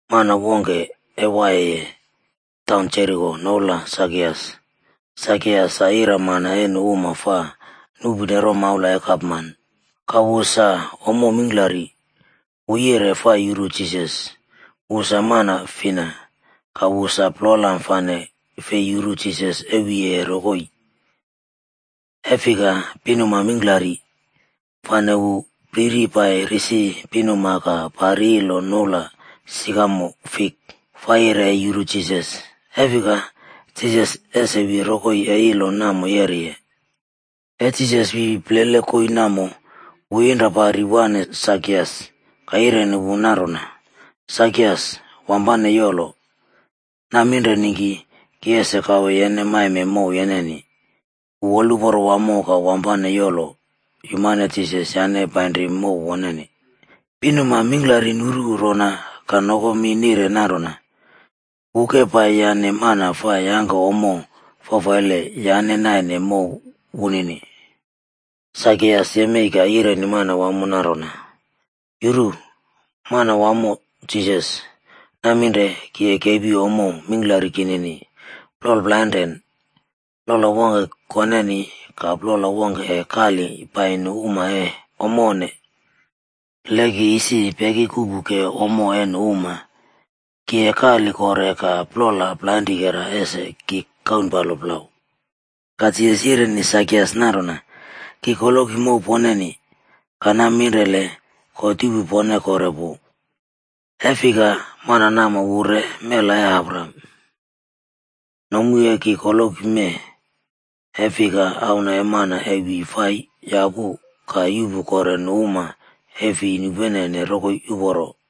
Mana wongke e waiyeye taun Jeriko noula Sakias. Sakias sa iramana e nu uma fa nuꞌpune romaula e gapman, ka wu sa ommo mingklari. Wu yire fa yuru Jisas, wu sa mana fina. Ka wu sa polam fane fi yuru Jisas e wiyeye rokoi, e fika pinuma mingklari. Fane wu priri pai risi pinuma ka pari ilo noula Sikamo Fik fa yire e yuru Jisas. E fika, Jisas ese wi rokoi e ilo namo yeriye. E Jisas wi plele koii namo, wu yinra pari wane Sakias ka yireni wu nanrona, “Sakias, wampane yolo. Naminre ningki ki ese kawe yene maime mow yeneni.” Wu woluporo wamo ka wampane yolo yumane Jisas yane painri mow woneni. Pinuma mingklari nuru rona ka nokomi nire nanrona, “Wu ke pai yane mana fa yangke ommo fafaile yane naine mow wunini.” Sakias yemei ka yireni Manwamo nanrona, “Yuru, Manawamo Jisas! Naminre ki e kepi ommo mingklari kinini, plol plainren. Plola wongke koneni, ka plol wongke e kali pai nu uma e ommo onne. Le ki isi peki kuꞌpuke ommo e nu uma, ki e kali kore ka plola plainrikera ese ki kaunpalo plau.” Ka Jisas yireni Sakias nanrona, “Ki koloki mow poneni, ka naminrele God yuꞌpu pone kore pu. E fika, mana namo wu re mela e Abraham. Nomu e ki koloki mee, e fika Auna e Mana e wi fa yapu ka yuꞌpu kore nu uma e fi nupenene rokoi uporo.”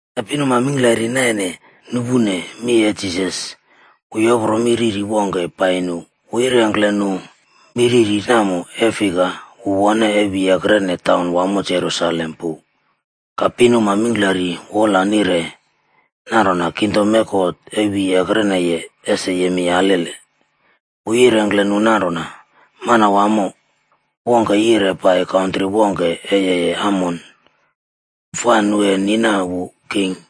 E pinuma mingklari naine nupune mi e Jisas, wu yopro mi riri wongke pai nu. Wu yirengkle nu mi riri namo e fika wu wone e wi ekrene taun wamo Jerusalem pu, ka pinuma mingklari wola nire nanrona kingdom e God e wi ekreneye ese yemei alele. Wu yirengkle nu nanrona, “Manawamo wongke yire pai kantri wongke e yeye amon, fa nu e nina wu king,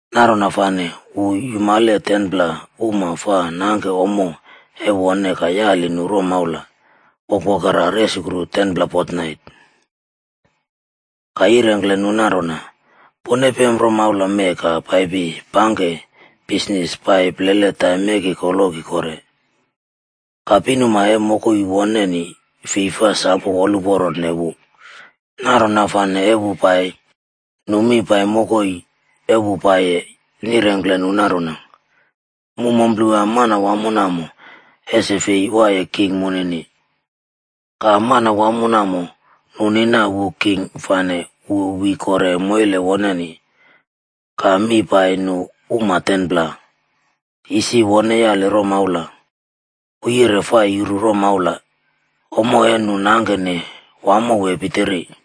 Nanrona fane wu yumale 10pla uma fa nangke ommo e wone ka yali nu romaula wokwokera resukru 10pla fotnait. Ka yirengkle nu nanrona, ‘Pone pem romaula mee ka paipi pangke bisnis pai plele taim e ki koloki kore.’ “Ka pinuma e mokoi woneni fi fa sam woluporone wu, nanrona fane e wu pai, nu mi pai mokoi e wu paiye nirengkle nu nanrona, ‘Mu mumplewa manawamo namo ese fei waiye king munini.’ “Ka manawamo namo, nu nina wu king fane wu wi kore moile woneni. Ka mi pai nu uma 10pla, isi wone yali romaula, wu yire fa yuru romaula, ommo e nu nangkene wamo wee pitiri.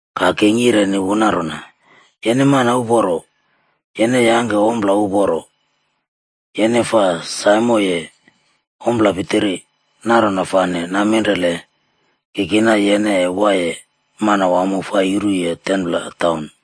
“Ka king yireni wu nanrona, ‘Yene mana uporo, yene yangke ompla uporo. Yene fa saimoye ompla pitiri. Nanrona fane, naminrele ki kina yene e waiye manawamo fa yuruye 10pla taun.’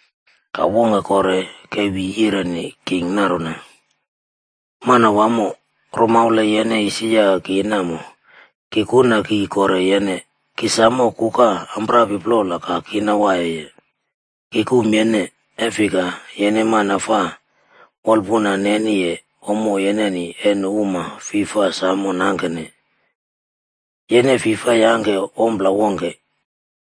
“Ka wongke kore ke wi yireni king nanrona, ‘Manwamo, romaula e yene isi yake ki namo, ki kuna kii kore yene. Ki samo kuka amprapi plola ka kina waiye. Ki kum yene, e fika yene mana fa wolpuna neniye ommo yeneni e nu uma fi fa samo nangkene. Yene fi fa yangke ompla wongke.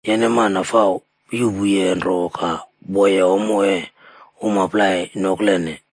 Yene mana fa yuꞌpuye nro ka woye ommo e uma plai noklene.’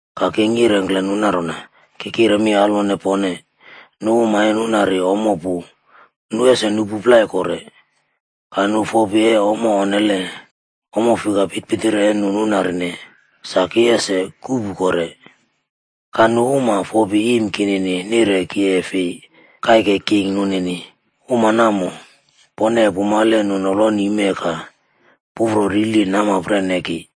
“Ka king yirengkle nu nanrona, ‘Ki kire mi alwone pone, nu uma e nunari ommo pu, nu ese nuꞌpu plai kore, ka nu fopi e ommo onnele, ommo fika pitpitiri e nu nunarine, sa ki ese kuꞌpu kore. Ka nu uma fopi iim kinini nire ki e fi kaike king nunini, uma namo pone e pumale nu noloni mee ka pufro rili namapren e ki.’”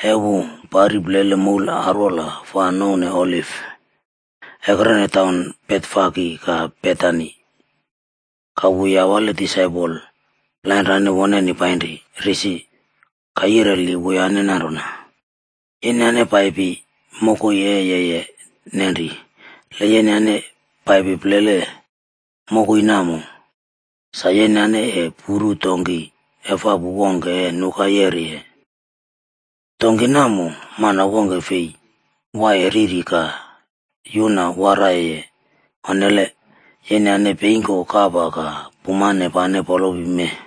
E wu pari plele moul arwola fa nouwne Oliv, ekrene taun Betfage ka Betani, ka wu yawale disaipol plainrane woneni painri risi. Ka yireli wuyane nanrona, “Yenyane paipi mokoi e yeye nanri. Le yenyane paipi plele mokoi namo, sa yenyane e puru donki efapu wongke e nuka yeriye. Donki namo, mana wongke fei waiye riri ka yuna waraiyeye onnele. Yenyane peingko kapa ka pumane pane polopi mee.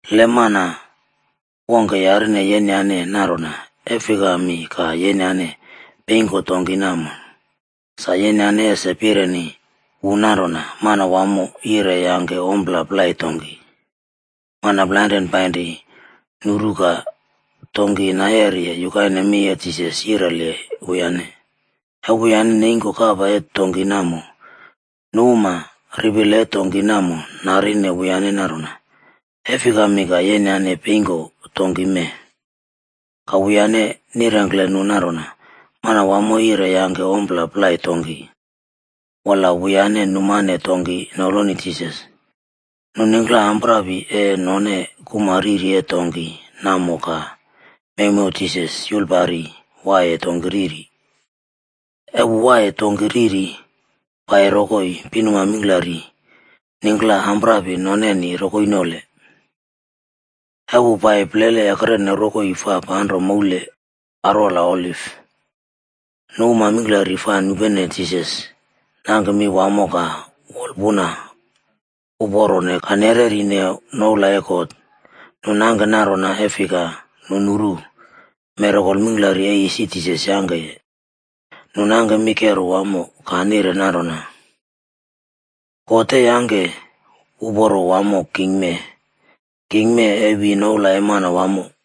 Le mana wongke yarine yenyane nanrona, ‘E fikami ka yenyane peingko donki namo.’ Sa yenyane ese pireni wu nanrona, ‘Manawamob yire e yangke ommo plai donki.’” Mana plainrane painri, nuru ka donki nayeriye yukaine mi e Jisas yireni wuyane. E wuyane neingko kapa e donki namo, nu uma ripile e donki namo narine wuyane nanrona, “E fikami ka yenyane peingko donki mee?” Ka wuyane nirengkle nu nanrona, “Manwamo yire e yangke ommo plai donki.” Wola wuyane numane donki noloni Jisas. Nu ningkla amprapi e none kuma riri e donki namo ka mewmew Jisas yulpari waiye donki riri. E wu waiye donki riri paiye rokoi, pinuma mingklari ningkla amprapi noneni rokoi nole. E wu pai plele ekrene rokoi fa panro moule arwola Oliv, nu uma mingklari fa nupene Jisas nangke mi wamo ka wolpuna uporone ka nerernane noula e God. Nu nangke nanrona e fika, nu nuru mirakol mingklari e isi Jisas yangkeye. Nu nangke mi kero wamo ka nire nanrona, “God e yangke uporo wamo king mee. King mee e wi noula e Manwamo.”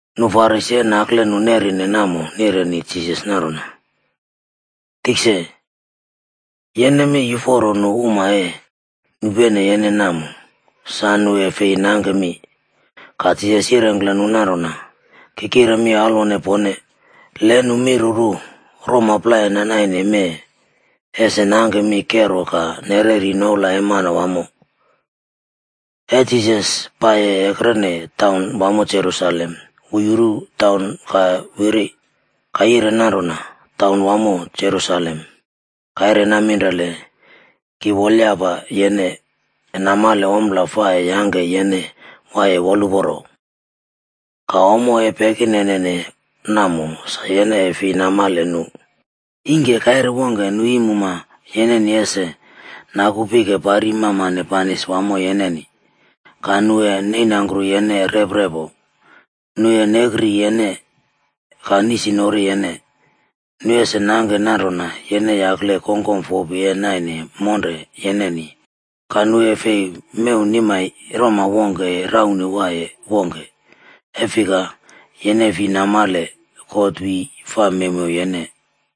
Nu Farisi e nakle nu nerine namo nireni Jisas nanrona, “Tikse, yene mi yuforo nu uma e nupene yene namo, sa nu e fi nangke mi.” Ka Jisas yirengkle nu nanrona, “Ki kire mi alwone pone, le nu miruru, roma plai nanaine mee ese nangke mi kero ka nereri noula e Manwamo.” E Jisas pai ekrene taun wamo Jerusalem, wu yuru taun ka wiri. Ka yire nanrona, “Taun wamo Jerusaleme, kaire naminrele ki wolyapa yene e namale ommo fa e yangke yene waiye woluporo. Ka ommo e pekinenene namo sa yene e fi namale nu. Ingke kaire wongke, nu iim uma yeneni ese naku pike pari mamane banis wamo yeneni. Ka nu e neinangkru yene reprepo. Nu e nekrire yene ka nisnori yene. Nu ese nangke nanrona yene yakle kongkom fopi e naine monre yeneni. Ka nu e fi mew nimai roma wongke e raunwaiye wongke, e fika, yene fi namale God wi fa mewmew yene.”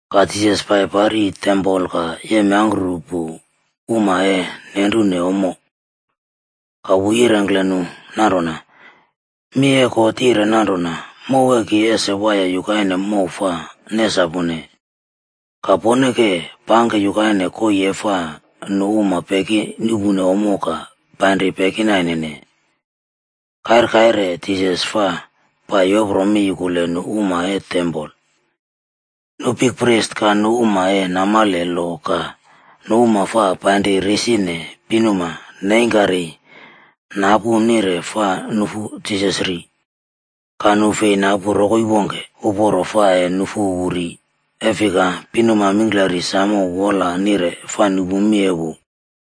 Ka Jisas pai pari tempol ka yemyangkrupu uma e nenrune ommo. Ka wu yirengkle nu nanrona, “Mi e God yire nanrona, ‘Mow e ki ese waiye yukaine mow fa nesapune.’ Ka pone ke pangke yukaine koii e fa nu uma peki nuꞌpu ommo ka painri pekinainene.” Kair kaire Jisas fa pai yopro mi yukule nu uma e tempol. Nu bikpris ka nu uma e namale lo ka nu uma fa painri risine pinuma neingkari napu nire fa nufu Jisas ri. Ka nu fei napu rokoi wongke uporo fa e nufu wu ri, e fika pinuma mingklari samo wola nire fa nupu mi e wu.